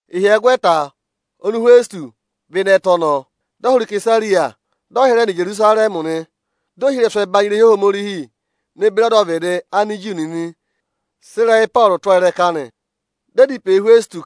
Ịhyẹgwẹta oni Ịhwẹsịtọsị vẹ ịnị ẹtẹ ọnọọ, dị ọ hụrẹ Isesariya, dị ọ hịrẹ nọ Ijerusarẹmị nị. Dị ohirẹsụ ẹbanyị irehi Ohomorihi ne beri ọdọvịdị Aniju nịnị sị ịrẹyị Ịpọọrụ tụ́ ọọ ịrẹka nị. Dị ẹ dá ịpẹ yị Ịhwẹsịtọsị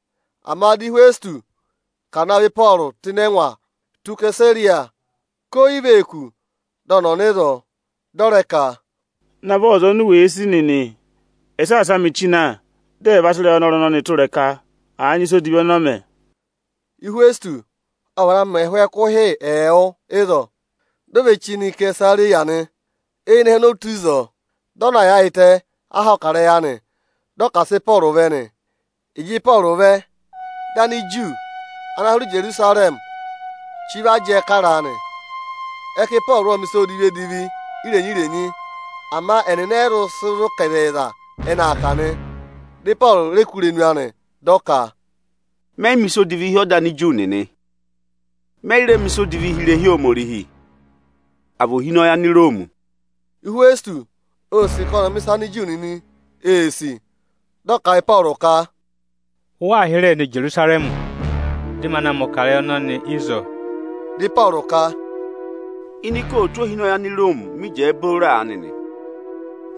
Ama dị Ịhwẹsịtọsị ka à navọ Ịpọọrụ tụ́ ịnị ẹngwa tụ́ Isesariya, ka oyi vee kù dị ọnị ọ̀ nọ ịzọọ. Dị ọ rẹ ka, “Navọ aza oni u wèe sì nịnị ẹ̀ saasa mị chí na, dị ẹ̀ va sị ịrẹyị ọnọrụ ọnọọ tụ́ ịrẹka, àa nyị ịsa odivi ọnọọ mẹ.” Ịhwẹsịtọsị ộ vana mẹ ẹhụụ ẹkụhị ẹẹwụ ịzọọ, di o ve chí nọ Isesariya nị. Eyinẹhẹ ọnị o tù ịzọọ, dị ọ na yaayịtẹ aha ọkarẹyị anị, dị ọ ka à sị Ịpọọrụ vẹ nị. Ịjị Ịpọọrụ vẹ, dị Aniju ana hụrẹ Ijerusarẹmị chí vẹ jẹẹ karaa nị. Ẹ ka Ịpọọrụ ộ mẹ̀ ịsa edivi-edivi irenyi-renyi. Ama ẹnịnị ẹ yị zụ sị zụ̀ ka ịzẹyịza ẹ́nị aa kà nị. Dị Ịpọọrụ rẹ kụ́ irenu anị, dị ọ ka, “Mẹ yị mẹ̀ ịsa odivi hi ọda Aniju nịnị, mẹyị rẹ mẹ̀ ịsa odivi hi irehi Ohomorihi, àa vị ohinọyị Aniroomi.” Ịhwẹsịtọsị ô sì ka ọnị ọ̀ mẹ̀ ịsa ana Aniju nịnị ee sì, dị ọ kà a yị Ịpọọrụ ka, “Ụ waa hịrẹẹ nọ Ijerusarẹmị, dị ma na mẹ̀ ọkarẹyị ịrẹyị ọnọnị ịzọọ?” Dị Ịpọọrụ ka, “Ini ikootu ohinọyị Aniroomi mị jẹẹ booro aanị nị,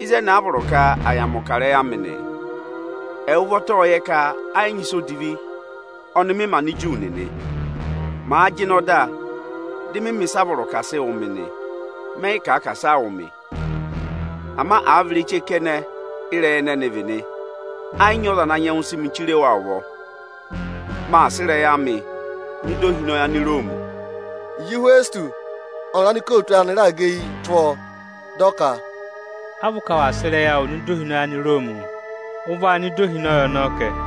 ịzẹnị a vọrọ ka à yà mẹ̀ ọkarẹyị amị nị. Ẹwụ ụvọta ộ yẹ ka ẹ yị nyị ịsa odivi ọnị mị mẹ Aniju nịnị. Màa jịnẹ ọda, dị mị mẹ̀ ịsaa vọrọ ka à sị wụ̀ mị nị, mẹ yị kà ka asị aa wụ̀ mị. Ama àa vị ireche kẹnẹ ị́rẹyị ẹnịị vị nị, ẹ yị nyị ọza ana nyẹngụ sị mị chire wa ụvọ. Maa sị ịrẹyị amịị nọ ịda ohinọyị Aniroomi.” Ịjị Ịhwẹsịtọsị ọnịrị anikootu anị raà gẹ eyi tụ́ ọọ, dị ọ ka, “A vị ụ ka waa sị ịrẹyị awụụ nọ ịda ohinọyị Aniroomi? Ụ vaa nọ ịda ohinọyị ọnọọ kẹ.”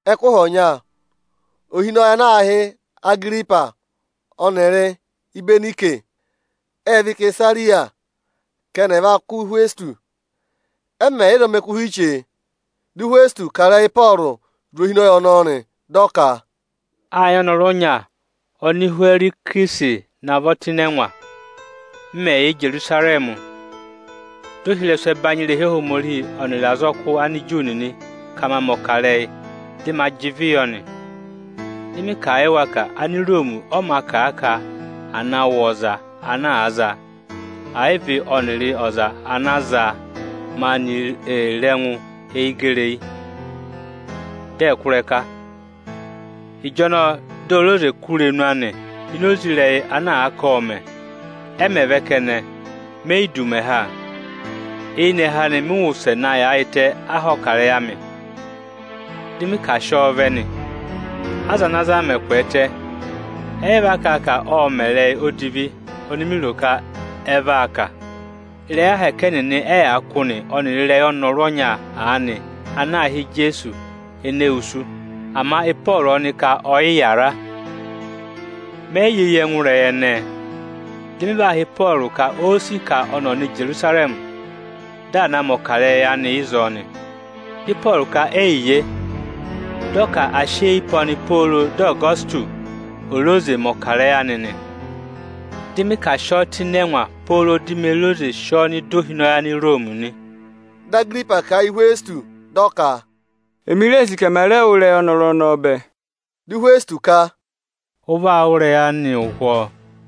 Ẹkụhị ọnya, ohinọyị ana aā hị́ Agiripa ọnịrị Ịbẹnayịsị ệ vẹ Isesariya ka ẹnị ẹ̀ va kụ́ Ịhwẹsịtọsị. Ẹ mẹ̀ yà ịzọọ mẹ ẹkụhị chee, di Ịhwẹsịtọsị kà ịrẹyị Ịpọọrụ zụ̀ ohinọyị ọnọọ nị. Dị ọ ka, “Â nyị ọnọrụ ọnya oni Ịhwẹrịsị navọ tụ́ ịnị ẹngwa. M mẹ̀ yà Ijerusarẹmị, dị ohirẹsụ ẹbanyị irehi Ohomorihi ọnịrị azọkụ Aniju nịnị ka ma mẹ̀ ọkarẹyị, dị ma jị ịvị yọ nị. Dị mị kà a yị wa ka Aniroomi ọ mā kà a ka à na wụ̀ ọza ana àa za, ẹ̀ yị vị ọnịrị ọza ana zaa maanị ee re ẹngụ eyi gẹrị eyi, dị ẹ̀ kụ́ ịrẹka. Ịjọnọọ di ò re oze kụ́ irenu anị ini oze ịrẹyị ana àa ka ộ mẹ̀. Ẹ mẹ̀ vẹ kẹnẹ, me yi du ụmẹ ha. Eyinẹhẹ anị mị wụsẹ na yaayịtẹ aha ọkarẹyị amị, dị mị ka à sị ọọ vẹ nị. Aza ana zaa mẹ̀ kwẹẹtẹ, ẹyị va kà a ka ộ mẹ̀ ịrẹyị odivi oni mi ro ka ẹ vaa kà. Ịrẹyị ahẹkẹ ẹnịnị ẹ́ yaa kụ́ nị ọnịrị ịrẹyị ọnọrụ ọnya aanị ana aā hị́ Ijeesu ene wusu. Ama Ịpọọrụ ọnị ka ọ yị yàra. Mẹ yị yẹ eyi ẹngụ ịrẹyị ẹnẹẹ. Dị mị va họ̀ Ịpọọrụ ka óó sì ka ọnị ọ̀ nọ Ijerusarẹmị, dị à na mẹ̀ ọkarẹyị anị ịzọọ nị. Dị Ịpọọrụ ka eyiye, dị ọ ka à sị eyi pe ọnị pooro dị Ọgọsịtọsị ò re oze mẹ̀ ọkarẹyị anị nị. Dị mị ka à sị ọọ tụ́ ịnị ẹngwa pooro di me re oze sị ọọ nọ ịda ohinọyị Aniroomi nị.” Dị Agiripa kà a yị Ịhwẹsịtọsị dị ọ ka, “Emi ree sì ka ẹmà rẹ wụ́ ịrẹyị ọnọrụ ọnọọ bẹẹ.” Dị Ịhwẹsịtọsị ka, “Ụ vaa wụ́ ịrẹyị anị ụhwọọ.”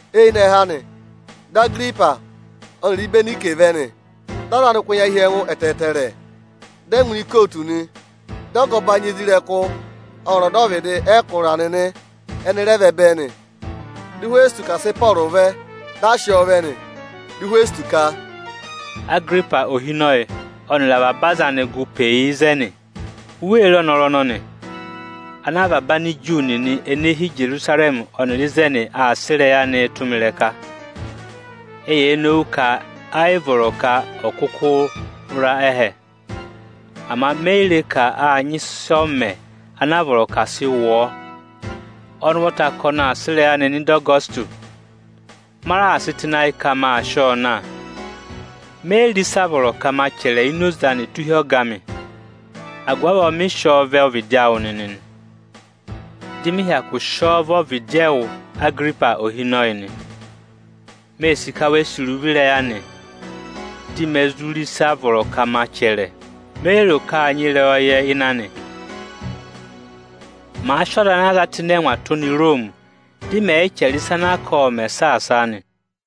Eyinẹhẹ anị, dị Agiripa ọnịrị Ịbẹnayịsị vẹ nị. Dị aza anị kụ́ ẹnya hi ẹngụ ẹtẹẹtẹrẹ, dị ẹ ngụ ini ikootu nị. Dị ọga ẹbanyị isoja nịnị ọnịrị ọdọvịdị ẹkụra nịnị ẹnị rẹ vẹ bẹẹ nị. Dị Ịhwẹsịtọsị ka à sị Ịpọọrụ vẹ, dị a sị ọọ vẹ nị. Dị Ịhwẹsịtọsị ka, “Agiripa ohinọyị ọnịrị avaba aza ana gụ pe yi ịzẹnị! U wee re ọnọrụ ọnọnị, ana avaba Aniju nịnị ene hi Ijerusarẹmị ọnịrị ịzẹnị aa sị ịrẹyị anịị tụ́ mị ịrẹka. Eyee nowu ka ayị vọrọ ka ọ̀ kụkụ ra ẹ́hẹ. Ama me yi re ka â nyị ịsị ọ mẹ anaa vọrọ ka à sị wụ ọọ. Ọnị ụvọta ka ọnị aa sị ịrẹyị anịị nọ ịda Ọgọsịtọsị. Ma raà sị tụ́ ịnị ayị ka maa sị ọọ na. Me yi re ịsị a vọrọ ka ma chẹrẹ ini oze anị tụ́ hi ọga amị. Agụvị avọọ mị sị ọọ vẹ ọvịdị awụ nịnị, dị mị hyakụ sị ọọ vẹ ọvịdị ẹwụ, Agiripa ohinọyị nị. Mee sì ka we sì iruvo ịrẹyị anị, di me zụ re ịsị a vọrọ ka ma chẹrẹ. Me yi ro ka â nyị ịrẹyọyẹ ịnị anị, màa sị ọza anaa za tụ́ ịnị ẹngwa tụ́ nọ Iroomi, dị mẹ̀ yị chẹrẹ ịsa anaa ka ộ mẹ̀ saasaa nị.”